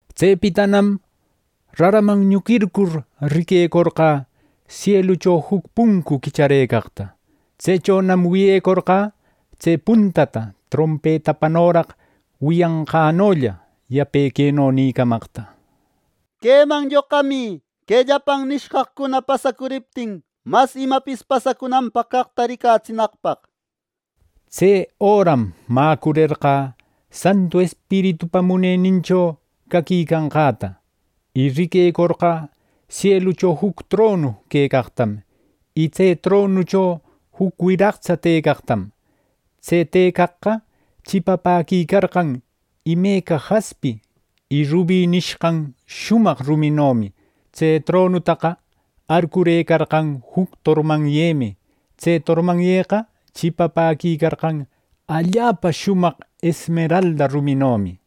Tsepitanam raraman ñuquircur, riquecorqä sielucho juc puncu quicharëcaqta. Tsechonam wiyecorqä tse puntata trompetapanoraq wiyanqannolla yape queno nïcamaqta: “Queman lloqamï que llapan nishqaqcuna pasacuriptin mas imapis pasacunanpaq caqta ricatsinaqpaq” nir. Tse öram mäcurerqä Santu Espiritupa munenincho caquicanqäta. Y riquecorqä sielucho juc tronu quecaqtam, y tse tronucho juc wiraqtsa tëcaqtam. Tse tëcaqqa chipapäquicarqan imeca jaspi y rubi nishqan shumaq ruminomi. Tse tronutaqa arcurëcarqan juc tormanyemi. Tse tormanyeqa chipapäquicarqan allapa shumaq esmeralda ruminomi.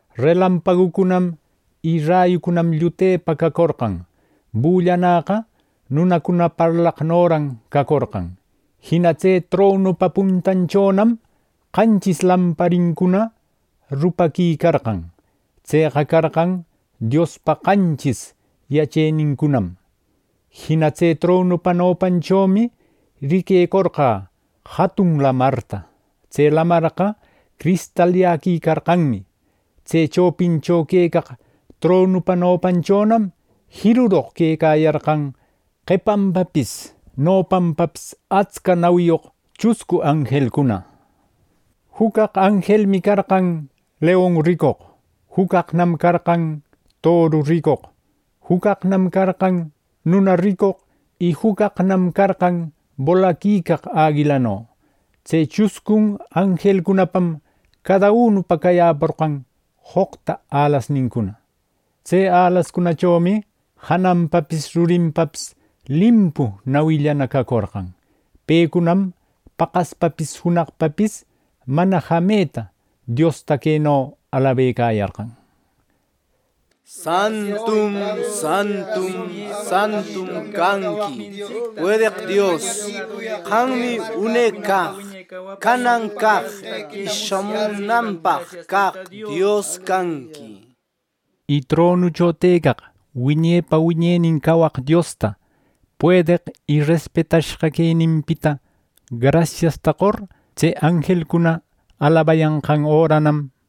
Relampagucunam y rayucunam llutepa cacorqan. Bullanäqa nunacuna parlaqnoran cacorqan. Jina tse tronupa puntanchonam qanchis lamparincuna rupaquicarqan. Tseqa carqan Diospa qanchis yachenincunam. Jina tse tronupa nopanchomi riquecorqä jatun lamarta. Tse lamarqa cristalyäquicarqanmi. Tse chopicho quecaq tronupa nopanchonam jiruroq quecayarqan qepanpapis nopanpapis atsca nawiyoq chuscu anjelcuna. Juc caq anjelmi carqan leon ricoq, juc caqnam carqan toru ricoq, juc caqnam carqan nuna ricoq y juc caqnam carqan bolaquicaq aguilano. Tse chuscun anjelcunapam cada unupa cayäporqan joqta alasnincuna. Tse alascunachomi jananpapis rurinpapis limpu nawillana cacorqan. Pecunam paqaspapis junaqpapis mana jameta Diosta queno alabecayarqan: “Santum, Santum, Santum canqui, puedeq Dios. Qammi une caq, canan caq, y shamunanpaq caq Dios canqui” nir. Y tronucho tëcaq wiñepa wiñenin cawaq Diosta, puedeq y respetashqa queninpita grasiasta qor, tse anjelcuna alabayanqan öranam,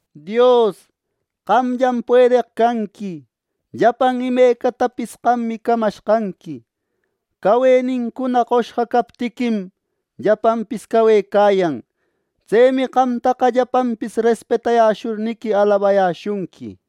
“Dios, qamllam puedeq canqui. Llapan imecatapis qammi camashqanqui. Cawenincuna qoshqa captiquim, llapanpis cawecayan. Tsemi qamtaqa llapanpis respetayäshurniqui, alabayäshunqui” nir.